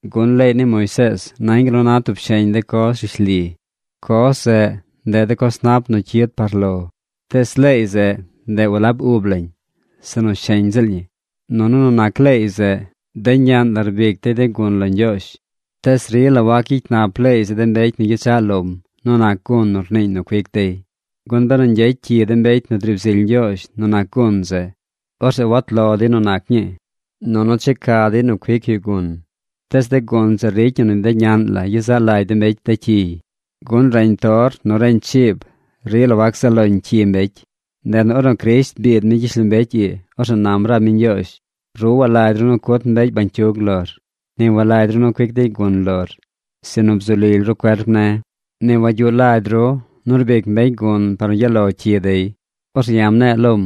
Gun leey ni Moisees nañ gal nu na tub sheñ de coz rishli. Coz zeꞌ, ndeꞌ de coz nap nu cyid par lo. Tees leey zeꞌ, ndeꞌ walab ub lañ, sinu sheñ ziꞌl ñi. Nunu nu nac leey zeꞌ, de ñaꞌn la rbic dey de gun lo Ñgyoozh. Tees rila wac gyicy nap leey zeꞌ de mbecy nu gyechaꞌ lom nu nac gun nu rniiñ nu cuic dey, gun benu ñgyecy cyi de mbecy nu driib zily Ñgyoozh nu nac gun zeꞌ, orzeꞌ wat lo dey nu nac ñii. Nunu checa dey nu cuic yu gun. Tees de gun zeꞌ ricy ñi nu de ñaꞌn la yezaꞌ lagy de mbecy de cyiy. Gun reñ tor nu reñ chiib rila wac zaꞌ loñ cyi mbecy. Ndeꞌ nu ornu Crisht biid mi gyishlombecy ii, orzeꞌ nam rab mi Ñgyoozh: Ru walagy ru nu cut mbecy bañcyug lor. Ni walagy ru nu cuic dey gun lor, sinu bzu lily ru cuerp ne̱. Ni wagyuꞌ lagy ru nu rbic mbecy gun par nu gyaꞌ lo cyi dey. Orzeꞌ ya̱ mne̱e̱ lom: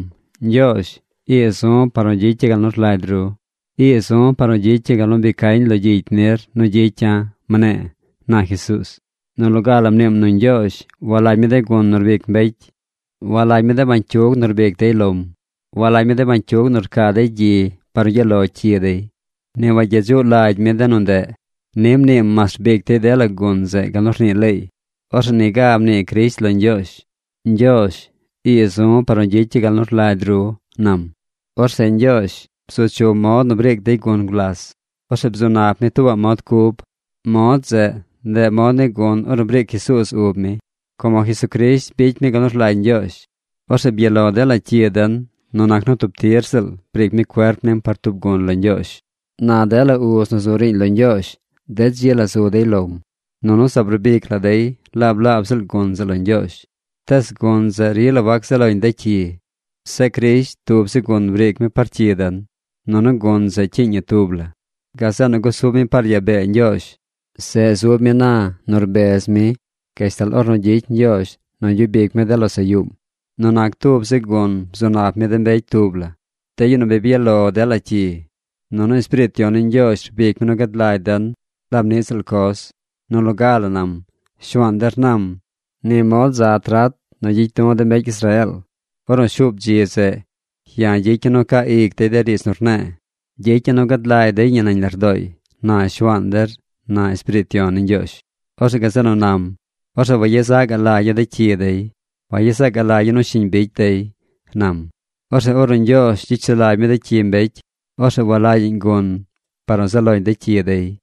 “Ñgyoozh, ii zu̱ par nu gyicya̱ gal nu rlagy ru. Ii zu̱ par nu gyicya̱ gal nu bi cañ lo gyicy nir nu gyicya̱”, mne̱e̱, na Jesuuz. Nu loga la mniim nu Ñgyoozh walagy mi de gun nu rbic mbecy. Walagy mi de bañcyug nu rbic dey lom. Walagy mi de bañcyug nu rcaa dey gyi par nu gyaꞌ lo cyi dey. Ni wagyedzuꞌ lagy mi de nu ndeꞌ. Ni mniim mas rbic dey dela gun zeꞌ gal nu rnii leey. Orzeꞌ niga mnii Crisht lo Ñgyoozh: “Ñgyoozh, ii zu̱ par nu gyicya̱ gal nu rlagy ru”, nam. Orzeꞌ Ñgyoozh bzu chum mod nu briic dey gun gulas. Orzeꞌ bzu nap mi tuubaꞌ mod cub. Mod zeꞌ, ndeꞌ mod ni gun ornu briic Jesuuz ub mi. Como Jesucrisht bicy mi gal nu rlagy Ñgyoozh, orzeꞌ byaꞌ lo dela cyi den nu nac nu tub tir ziꞌl briic mi cuerp nim par tub gun lo Ñgyoozh. Na dela uz nu zu riiñ lo Ñgyoozh de dzi la zu dey lom, nunu zaab rbic la dey laab laab ziꞌl gun zeꞌ lo Ñgyoozh. Tees gun zeꞌ rila wac zaꞌ loñ de cyi. Zeꞌ Crisht tub zi gun briic mi par cyi den. Nunu gun zeꞌ cyiiñ ñi tub la. Gazeꞌ nu gusub mi par yaa bee Ñgyoozh. Zeꞌ zub mi na nu rbez mi gashtal ornu gyicy Ñgyoozh nu gyub ic mi de losaꞌ yuum. Nu nac tub zi gun bzu nap mi de mbecy tub la, de yu nu bi byaꞌ lo dela cyi. Nunu Espiriit Yon ni Ñgyoozh rbic mi nu gad lagy den laab niꞌ ziꞌl coz. Nu loga la nam: Shuaan der nam: Ni mod za trat nu gyicy du̱ de mbecy Israeel. Ornu shuub dzi zeꞌ, ya̱ gyicya̱ nu caa ic dey de riidz nu rne̱e̱. Gyicya̱ nu gad lagy dey ñi nañ lardooy, na Shuaan der, na Espiriit Yon ni Ñgyoozh. Orzeꞌ gazeꞌ nu nam: Orzeꞌ wayezaꞌ gaꞌ lagya̱ de cyi dey. Wayezaꞌ gaꞌ lagya̱ nu shiñ bicy dey, nam. Orzeꞌ ornu Ñgyoozh gyicy sulagy mi de cyi mbecy, orzeꞌ walagyaꞌñ gun par nu zaꞌ loñ de cyi dey.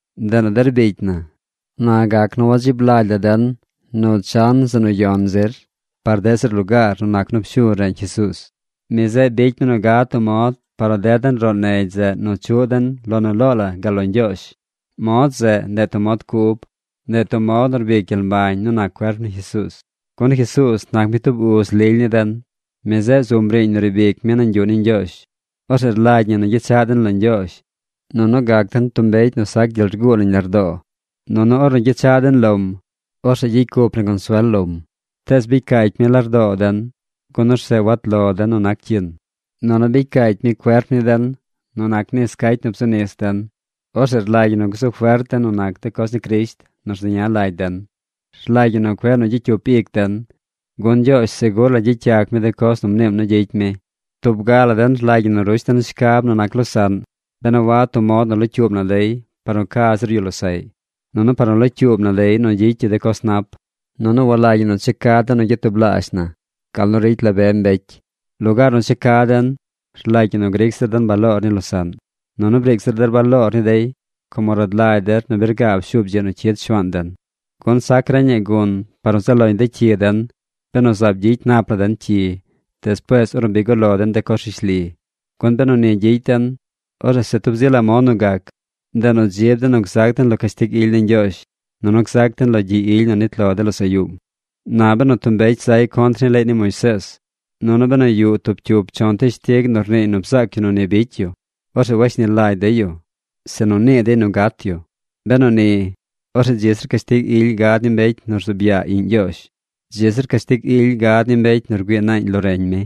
Ndeꞌ nu der bicy na, na gac nu wadzib lagy la den nu chan zeꞌ nu yon zir par deꞌ zir lugaar nu nac nu pshuu reñ Jesuuz. Mi zeꞌ bicy mi nu gad tub mod par nu ded den roꞌ negy zeꞌ nu chuꞌ den lo nu loo la gal lo Ñgyoozh. Mod zeꞌ, ndeꞌ tub mod cub. Ndeꞌ tub mod nu rbic gyel mbañ nu nac cuerp ni Jesuuz. Gun Jesuuz nac mi tub uz lily ni den. Mi zeꞌ zum riiñ nu riib ic mi nañ yuꞌ ni Ñgyoozh. Orzeꞌ rlagy ñi nu gyechaꞌ den lo Ñgyoozh, nunu gac den tub mbecy nu sac gyel rguu nañ lardoo. Nunu ornu gyechaꞌ den lom, orzeꞌ gyicy cup na consuel lom. Tees bicy caacy mi lardoo den, gun orzeꞌ wat lo den nu nac cyin. Nunu bicy caacy mi cuerp ni den nu nis cacy nu bzu nis den. Orzeꞌ rlagy ñi nu gzu fert den nu nac de coz ni Crisht nu rzeña lagy den. Rlagy ñi nu cueꞌ nu gyicy cyup ic den, gun Ñgyoozh segur la gyicy yac mi de coz nu mniim nu gyicy mi. Tub ga la den rlagy ñi nu rush den shcab nu nac losaꞌn ben a wad tub mod nu locyuub na dey par nu ca zir yu losaꞌy, nunu par nu locyuub na dey nu gyicy yu de coz nap. Nunu walagy ñi nu checa den nu gyatublaazh na gal nu ricy la be mbecy. Lugaar nu checa den, rlagy ñi nu gric zir den baloor ni losaꞌn. Nunu briic zir der baloor ni dey como rad lagy der nu bi rgaab shuub dzi nu cyid Shuaan den. Gun sac reñaꞌ gun par nu zaꞌ loñ cyi den benu zaab gyicy nap la den cyi despuees ornu bi guꞌ lo den de coz rishli. Gun benu ni gyicy den, orzeꞌ se tub zi la mod nu gac, ndeꞌ nu dzib den nu gzac den lo cashtig ily ni Ñgyoozh, nunu gzac den lo gyi ily nu nit lo de losaꞌ yuum. Na benu tub mbecy zay contr ni leey ni Moisees, nunu benu yuꞌ tub cyup chon teshtig nu rniiy nu bzaac yu nu ni bicy yu, orzeꞌ washni lagy dey yu, sinu nii dey nu gat yu. Benu ni, orzeꞌ dzi zir cashtig ily gad ni mbecy nu rzuub yaa Iꞌñ Ñgyoozh. Dzi zir cashtig ily gad ni mbecy nu rgüii naañ lo reñ mi,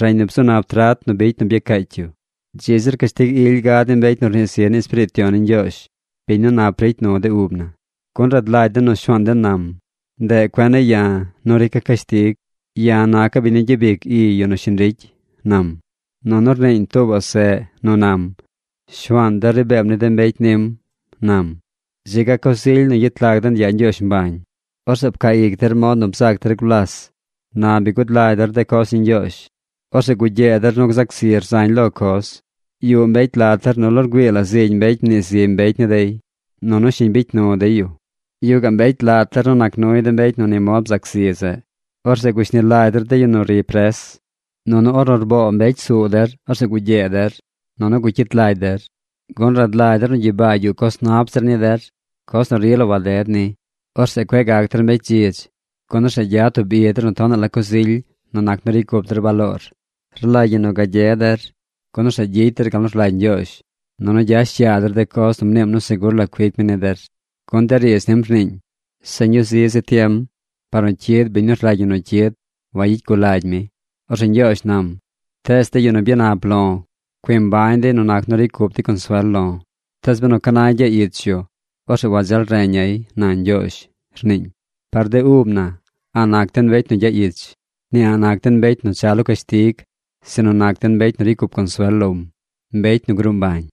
reñ nu bzu nap trat nu bicy nu byacaacy yu. Dzi zir cashtig ily gad ni mbecy nu rnii zi ni Espiriit Yon ni Ñgyoozh, biñ nu nap ricy nu de ub na. Gun rad lagy den nu Shuaan den nam: “Ndeꞌ cuen ne̱ ya̱ nu rica̱ cashtig. Ya̱ naca̱ biñ nu gyabic i yu nu shiñ ricy”, nam. Nunu rniiñ tuubaꞌ seꞌ nu nam: “Shuaan der ri beem ni de mbecy nim”, nam. ¡Dzi ga coz ily nu gyet lag den yaa Ñgyoozh mbañ! Orzeꞌ pcaa ic der mod nu bzac der gulas. Na bi gud lagy der de coz ni Ñgyoozh, orzeꞌ gugyee der nu gzac zir zañ lo coz. Yuꞌ mbecy lat der nu lo rgüii la zigy mbecy mnii zi mbecy ni dey, nunu shiñ bicy nu dey yu. Yuꞌ gaꞌ mbecy lat der nu nac nuy de mbecy nu ni mod bzac zi zeꞌ. Orzeꞌ gushni lagy der de yu nu ri pres. Nunu ornu rboo mbecy suu der, orzeꞌ gugyee der, nunu gucyit lagy der, gun rad lagy der nu gyibaa yuꞌ coz nap zir ni der, coz nu rila waded ni. Orzeꞌ cueꞌ gac der mbecy dzidz, gun orzeꞌ gyad tub i der nu tonaꞌ la coz ily nu nac nu ricy cup der baloor. Rlagy ñi nu gagye der, gun orzeꞌ gyicy der gal nu rlagy Ñgyoozh, nunu gyash yaa der de coz nu mniim nu segur la cuic mi ni der. Gun de riidz nim rniiñ: Se ñuu zi zi tiem par nu cyid biñ nu rlagy ñi nu cyid. Wayicy gul lagy mi. Orzeꞌ Ñgyoozh nam: Tees de yu nu byanap lo̱ cui mbañ dey nu nac nu ricy cup dey consuel lo̱. Tees benu ca nay gyaꞌ ich yu, orzeꞌ wadzeel reña̱y, na Ñgyoozh, rniiñ. Par de ub na a̱ꞌ nac den mbecy nu gyaꞌ ich. Ni a̱ꞌ nac den mbecy nu cha lo cashtig. Sinu nac den mbecy nu ricy cup consuel lom, mbecy nu gruu mbañ.